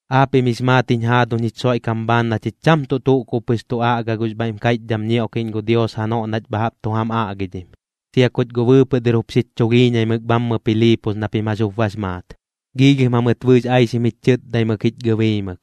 Aapiꞌm jix maat jiñ jaaduñ jich Xoiꞌkam bhaan na chich cham tuꞌ tuꞌ kub pɨx tu aꞌga gux bhaiꞌm kaiꞌchdham ñioꞌkiꞌñ gu Dios janoꞌ nach bha jaꞌp tu jam aꞌgidhim, sia kuch guꞌ bɨɨpɨꞌ dɨr jup xich chulhiiñaimɨk bhammɨ Piliipos na pim jax jup bax maat. Giilhim jamɨt bɨɨx aixim jich chɨtdaimɨk jich gɨbiimɨk,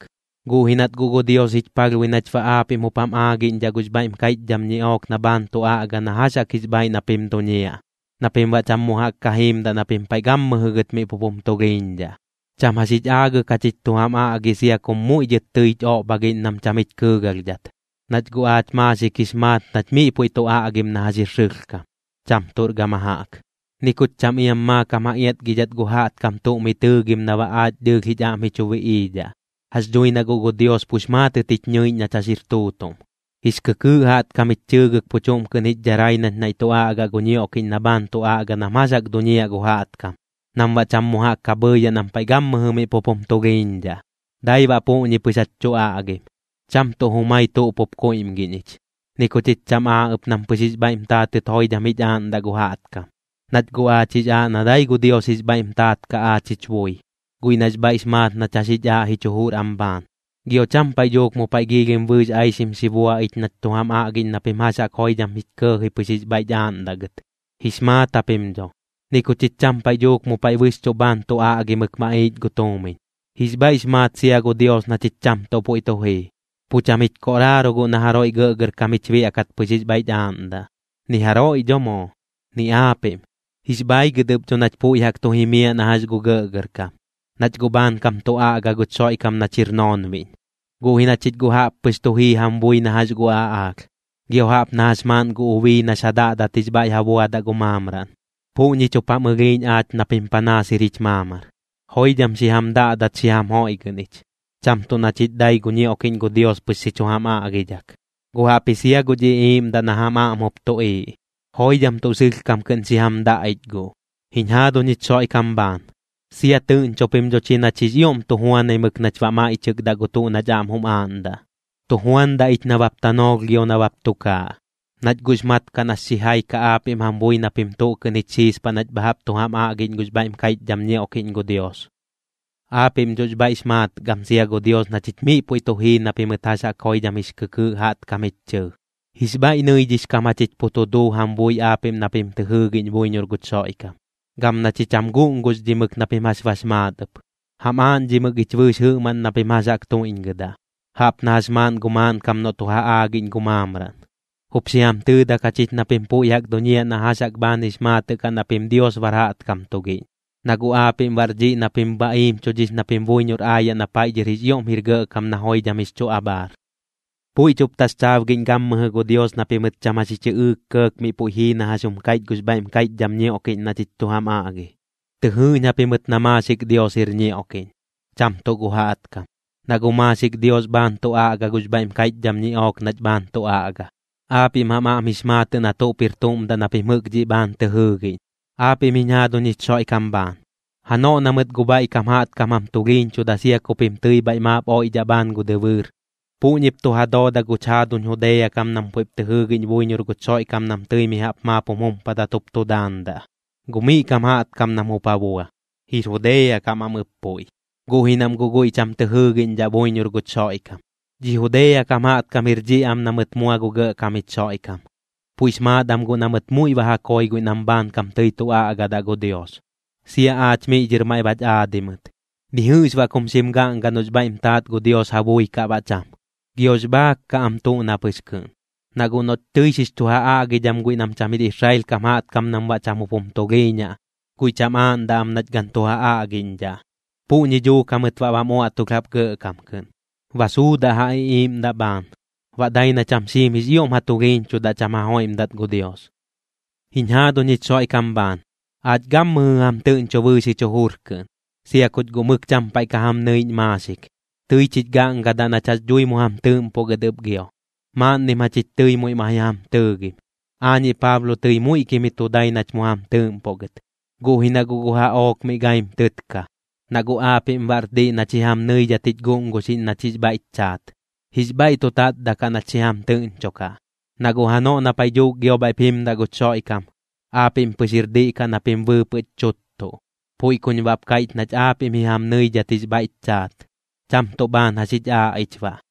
guꞌ ji nat guꞌ gu Dios jich palhbui nach baꞌ aapiꞌm jup jam aagiꞌñdhaꞌ gux bhaiꞌm kaiꞌchdham ñiꞌook na bhaan tu aꞌga na jax jaꞌk jix bhaiꞌ na pim duñiaꞌ, na pim baꞌ cham mu jaꞌk ka jiimdaꞌ na pim paiꞌ gammɨjɨ gɨt miꞌ pup jum tulhiiñdhaꞌ. Cham jax jich aagɨk jachich tu jam aꞌgi sia kum muiꞌ dhɨt tɨich oꞌbhagiꞌñ nam cham jich kɨɨgalhdhat. Nach guꞌ aach maaxik jix maat nach miꞌ puiꞌ tu aꞌgim na jax jir sɨlhkam, cham tuꞌr gama jaꞌk. Ni kuch cham iam maakam ja iatgidhat gu jaꞌtkam tuꞌ miꞌ tɨɨgim na baꞌ aach dɨɨlh jich aꞌm ji chu biꞌiidhaꞌ. Jax dhui na guꞌ gu Dios pux maatɨt jich ñɨiꞌñ nach jax jir tuutuꞌm. Jix kɨkɨɨꞌ jaꞌtkam jich chɨɨgɨk pu chuꞌm kɨꞌn jich dharai nach naiꞌ tu aꞌgaꞌ gu ñioꞌkiꞌñ na bhaan tu aꞌga nam jax jaꞌk duñiaꞌ gu jaꞌtkam, nam baꞌ cham mu jaꞌk ka bhɨɨyaꞌ nam paiꞌ gammɨjɨ miꞌ pup jum tulhiiñdhaꞌ. Dai baꞌ puꞌñi pɨx jach tu aꞌgim, cham tuꞌ jumai tuꞌ pup kuiꞌmgiꞌñ ich, ni ku chich cham aa ɨp nam pɨx jix bhaiꞌm taatɨt joidham jich aaꞌndaꞌ gu jaꞌtkam, nach guꞌ aach jix aaꞌ na dai gu Dios jix bhaiꞌm taat kaꞌ aach jich bui, guiꞌ nax bhaiꞌx maat nach jax jich aaꞌ jich jujur am bhaan. Gio cham paiꞌ dhuuk mu paiꞌ giilhim bɨɨx aixim xi bua ich nach tu jam aꞌgiꞌñ na pim jax jaꞌk joidham jich kɇɇji pɨx jix bhaiꞌch aaꞌndaꞌ gɨt, jix maat japim dho. Ni ku chich cham paiꞌ dhuuk mu paiꞌ bɨxchuꞌ bhaan tu aꞌgimɨk maꞌiich gu tuumiñ. Jix bhaiꞌx maat sia gu Dios na chich cham tuꞌ puiꞌ tu jii. Pu cham jich koꞌraaro guꞌ na jaroiꞌ gɇꞌgɇrkam jich biaꞌkat pɨx jix bhaiꞌch aaꞌndaꞌ, ni jaroiꞌ dho moo, ni aapiꞌm. Jix bhaigɨt ɨp dho nach puiꞌ jaꞌk tu jimiaꞌ na jax gu gɇꞌgɇrkam, nach guꞌ bhaankam tu aꞌga guch Xoiꞌkam nach jir noonbiꞌñ. Guꞌ ji na chich guꞌ jaꞌp pɨx tu jii jam bui na jax gu aꞌaalh, gio jaꞌp na jax maaꞌn gu ubii nax ja daꞌdat jix bhaiꞌ ja buadaꞌ gu maamraꞌn. Puꞌñich jup jam ɨlhiiꞌñ aach na pim panaas jir jich maamar. Joidham xi jam daꞌdat xi jam joiꞌgɨꞌn ich, cham tuꞌ na chich dai gu ñioꞌkiꞌñ gu Dios pɨx xi chu jam aꞌgidhak, guꞌ jaꞌpji sia guch iꞌiiꞌmdaꞌ na jam aꞌm jup tuꞌiiꞌ. ¡Joidham tuꞌ sɨlhkam kɨꞌn xi jam daꞌ ich guꞌ! Jiñ jaaduñ jich Xoiꞌkam bhaan, sia tɨꞌñcho pim dho chi nach jix ioꞌm tu juanaimɨk nach baꞌ maiꞌchɨkdaꞌ gu tuꞌ nach aꞌm jum aaꞌndaꞌ. Tu juandaꞌ ich nabap tanoolh gio nabap tukaaꞌ, nach guꞌx mat kaꞌ nax xijai kaꞌ aapiꞌm jam bui na pim tuꞌ kɨꞌn jich xiispaꞌ nach bha jaꞌp tu jam aꞌgiꞌñ gux bhaiꞌm kaiꞌchdham ñioꞌkiꞌñ gu Dios. Aapiꞌm dhox bhaiꞌx maat gam sia gu Dios na chich miꞌ puiꞌ tu jii na pimɨt jax jaꞌk joidham jix kɨkɨɨꞌ jaꞌtkam jich chɨɨ. Jix bhaiꞌ nɨidhix kam jachich pu tu duu jam bui aapiꞌm na pim tɨ jɨɨgiꞌñ buiñor guch Xoiꞌkam. Gam na chich jam guꞌnguxdhimɨk na pim jax bax maat ɨp, jam aaꞌñdhimɨk ich bɨɨx jɨꞌmaꞌn na pim jax jaꞌk tuiꞌñgɨdaꞌ, jaꞌp na jax maaꞌn gu maaꞌnkam noꞌ tu ja aagiꞌñ gu maamraꞌn. Jup xi jam tɨɨdak jachich na pim puiꞌ jaꞌk duñiaꞌ na jax jaꞌk bhaan jix maatɨꞌ kaꞌ na pim Dios bar jaꞌtkam tugiꞌñ, na guꞌ aapiꞌm bar dhiꞌ na pim ba iimchudhix na pim buiñor aayaꞌ na paiꞌ dhɨr jix ioꞌm jir gɇꞌkam na joidham jix chu abhaar. Puiꞌch jup taxchaabgiꞌñ gammɨjɨ gu Dios na pimɨt cham jax ji chɨꞌɨɨk kɇɇk miꞌ puiꞌ jii na jax jum kaiꞌch gux bhaiꞌm kaiꞌchdham ñioꞌkiꞌñ na chich tu jam aꞌgi. Tɨ jɨɨꞌñ japimɨt na maaxik Dios jir ñioꞌkiꞌñ, cham tuꞌ gu jaꞌtkam. Na guꞌ maaxik Dios bhaan tu aꞌga gux bhaiꞌm kaiꞌchdham ñiꞌook nach bhaan tu aꞌga. Aapiꞌm jam aꞌm jix maatɨꞌ na tuꞌp jir tuꞌm daꞌ na pim jɨꞌk dhiꞌ bhaan tɨ jɨɨgiꞌñ. Aapiꞌm jiñ jaaduñ jich Xoiꞌkam bhaan, janoꞌ na mɨt gu bhaiꞌ kam jaꞌtkam jam tulhiiñchuda sia ku pim tɨi bhaiꞌ maap oiꞌdhaꞌ bhaan gu dɨbɨɨr, puꞌñip tu ja dooda guch jaaduñ Judea kam nam puiꞌp tɨ jɨɨgiꞌñ buiñor guch Xoiꞌkam nam tɨi mi jaꞌp maap jum jumpadat jup tu daandaꞌ. Gu miꞌ kam jaꞌtkam nam jup ja bua, jir Judea kam am ɨp puiꞌ, guꞌ ji nam guꞌ guiꞌ cham tɨ jɨɨgiꞌñdhaꞌ buiñor guch Xoiꞌkam. Dhi Judea kam jaꞌtkam jir dhiꞌ am na mɨt mua gu Gɇꞌkam jich Xoiꞌkam, puiꞌx maat am guꞌ na mɨt muiꞌ ba ja koi guiꞌ nam bhaankam tɨi tu aꞌgadaꞌ gu Dios. Sia aach miꞌ dhɨr maiꞌ bach aadi mɨt. Ni jɨꞌx baꞌ kum xim gaꞌngadaꞌ noꞌx bhaiꞌm taat gu Dios ja bui kaꞌ baꞌ cham. Giox bhaak kaꞌ am tuꞌ na pɨx kɨꞌn, na guꞌ noꞌch tɨi xix chu ja aꞌgidham guiꞌ nam cham jir Israel kam jaꞌtkam nam baꞌ cham jup jum tulhiiñaꞌ, guiꞌ cham aaꞌndaꞌ am nach gan tu ja aꞌgiꞌñdhaꞌ. Puꞌñi dhuuk jamɨt baꞌ bam uaꞌtulh jaꞌp gɇꞌkam kɨꞌn, ba suudaꞌ ja iꞌiiꞌmdaꞌ bhaan. Baꞌ dai na cham xiim jix ioꞌm ja tulhiiñchudaꞌ cham ja joiꞌmdat gu Dios. Jiñ jaaduñ jich Xoiꞌkam bhaan, aach gammɨjɨ jam tɨꞌñcho bɨɨx jich jujur kɨꞌn, sia kuch guꞌ mɨk cham paiꞌ ka jam nɨiꞌñ maaxik. Tɨich jich gaꞌngadaꞌ nach jax dhui mu jam tɨɨꞌmpoꞌ gɨt ɨp gio. Maaꞌnnim jachich tɨi muiꞌ ma ji jam tɨɨgim, aañiꞌ Paablo tɨi muiꞌkim ji tu dai nach mu jam tɨɨꞌmpoꞌ gɨt, guꞌ ji na guꞌ gu jaꞌook miꞌ gaim tɨtka. Na guꞌ aapiꞌm baꞌr diꞌ nach ji jam nɨidhat jich guꞌnguxiꞌñ nach jix bhaiꞌch chaat. Jix bhaiꞌ tu tatdaꞌ kaꞌ nach xi jam tɨꞌñchokaꞌ, na guꞌ janoꞌ na paiꞌ dhuuk gio bhaiꞌp jimdaꞌ guch Xoiꞌkam, aapiꞌm pɨx jir diꞌ kaꞌ na pim bɨɨpɨꞌch chuttuꞌ. Puiꞌ kuñ baꞌp kaiꞌch nach aapiꞌm ji jam nɨidhat jix bhaiꞌch chaat, cham tuꞌ bhaan jax jich aaꞌ ich baꞌ.